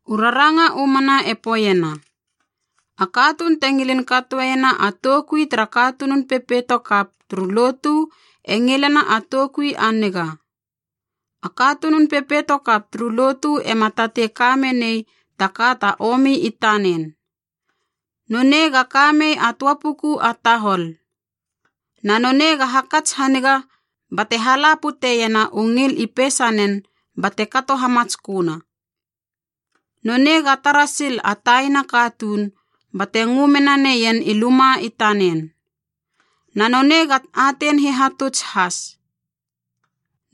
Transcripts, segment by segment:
U raranga u mana e poeiena, “A katuun te ngilin katoena a toukui tara katunun pepeito kap turu lotu e ngilena a toukui a niga.” A katunun pepeito kap turu lotu ema tatei ka menei ta ka ta omi i tanen. Nonei ga ka mei a töa puku a tahol. Na nonei ga hakats haniga bate hala puteiena u ngil i peisanen bate kato hamatsköna. Nonei ga tara sil a taina katuun bate ngö menaneien i luma i tanen. Na nonei ga atein hihatuts has.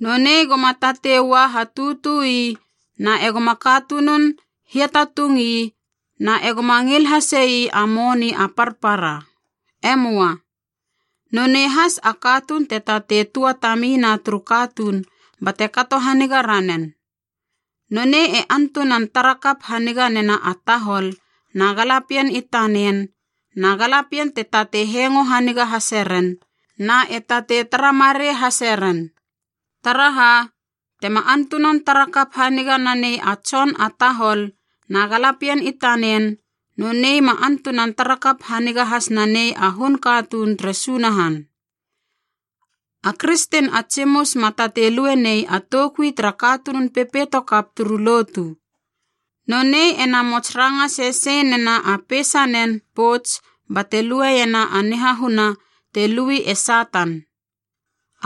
Nonei goma tatei ua hatutu ii na egoma katunun hiatatung ii na egoma ngil hasei a moni a parpara. E möa. Nonei has a katuun te tatei tuatamina turu katuun bate kato haniga ranen. Nonei e antunan tara kap haniga nena a tahol na galapien i tanen na galapien e tatei hengo haniga hase ren na e tatei tara marei hase ren. Taraha, tema antunan tara kap haniga nanei a tson a tahol na galapien i tanen, nonei ma antunan tara kap haniga has nanei a hun katuun tere Sunahan. A kristen a tsimus ma tatei lue nei a toukui tara katunun pepeito kap turu lotu. Nonei e namots ranga sesei nena a peisanen pouts bate lueiena a nihahuna te lui e Satan.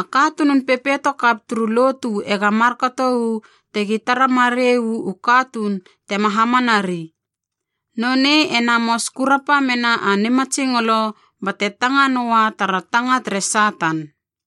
A katunun pepeito kap turu lotu ega markato uu tegi tara marei u katuun tema hamanari. Nonei e namos kurapa mena a nimatsingolo, bate tanga noa tara tanga tere Satan.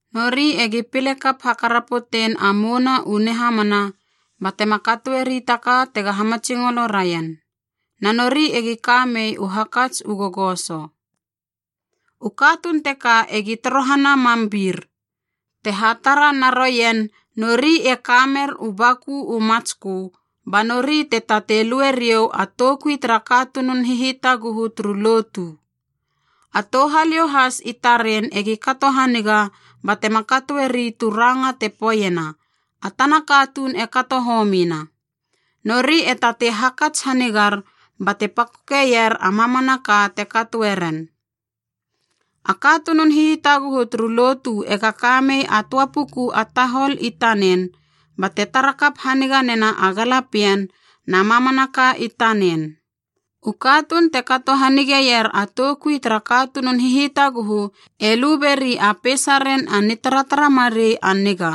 Nori egi pile kap hakarapotein a mouna u nihamana batema katoeri ta ka tega hamatsingolo raien, na nori egi ka mei u hakats u gogoso. U katuun teka egi torohana mam bir, te hatara na roien nori e ka mer u baku u matskö, ba nori te tatei lue riou a toukui tara katunun hihitaguhu turu lotu. A touhaliou has i taren egi kato haniga batema katoeri tu ranga te poeiena a tana katuun e kato homina. Nori e tatei hakats hanigar bate pakokeier a mamanaka te katoe ren. A katunun hitaguhu turu lotu ega ka mei a töa puku a tahol i tanen, bate tara kap haniga nena a galapien na mamanaka i tanen. U katuun te kato hanigeier a toukui tara katunun hihitaguhu e lu beri a peisaren a nitaratara marei a niga,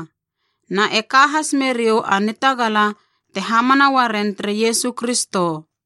na e ka has meriou a nitagala te hamana uaren tere Iesu Kristo.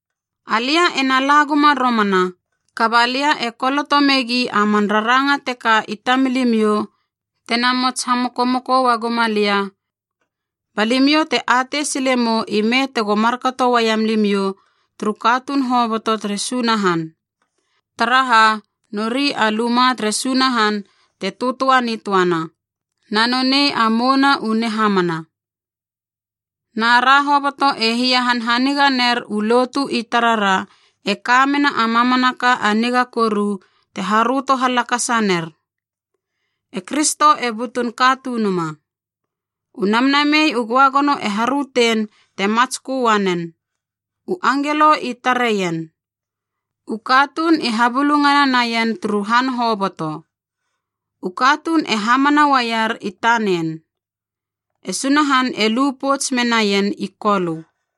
Alia ena la guma romana, kaba lia e koloto megi a man raranga teka i tamilimiou tena mots hamokomoko ua guma lia, ba limiou te atei sile mou ime tego markato uaiam limiou turu katuun hoboto tere Sunahan. Taraha nori a lumaa tere Sunahan te töatöa nitöana, na nonei a mouna u nihamana. Na ra hoboto e hia hanhaniga ner u lotu i tarara e ka mena a mamanaka a niga koru te haröto halakasa ner: E Kristo e butun Katunuma. U Namnamei u Göagono e harötein te matskö uanen. U angelo i tareien. U katuun i habulungana naien turu han hoboto. U katuun e hamana uaier i tanen. E Sunahan e lu pouts menaien i Kolö.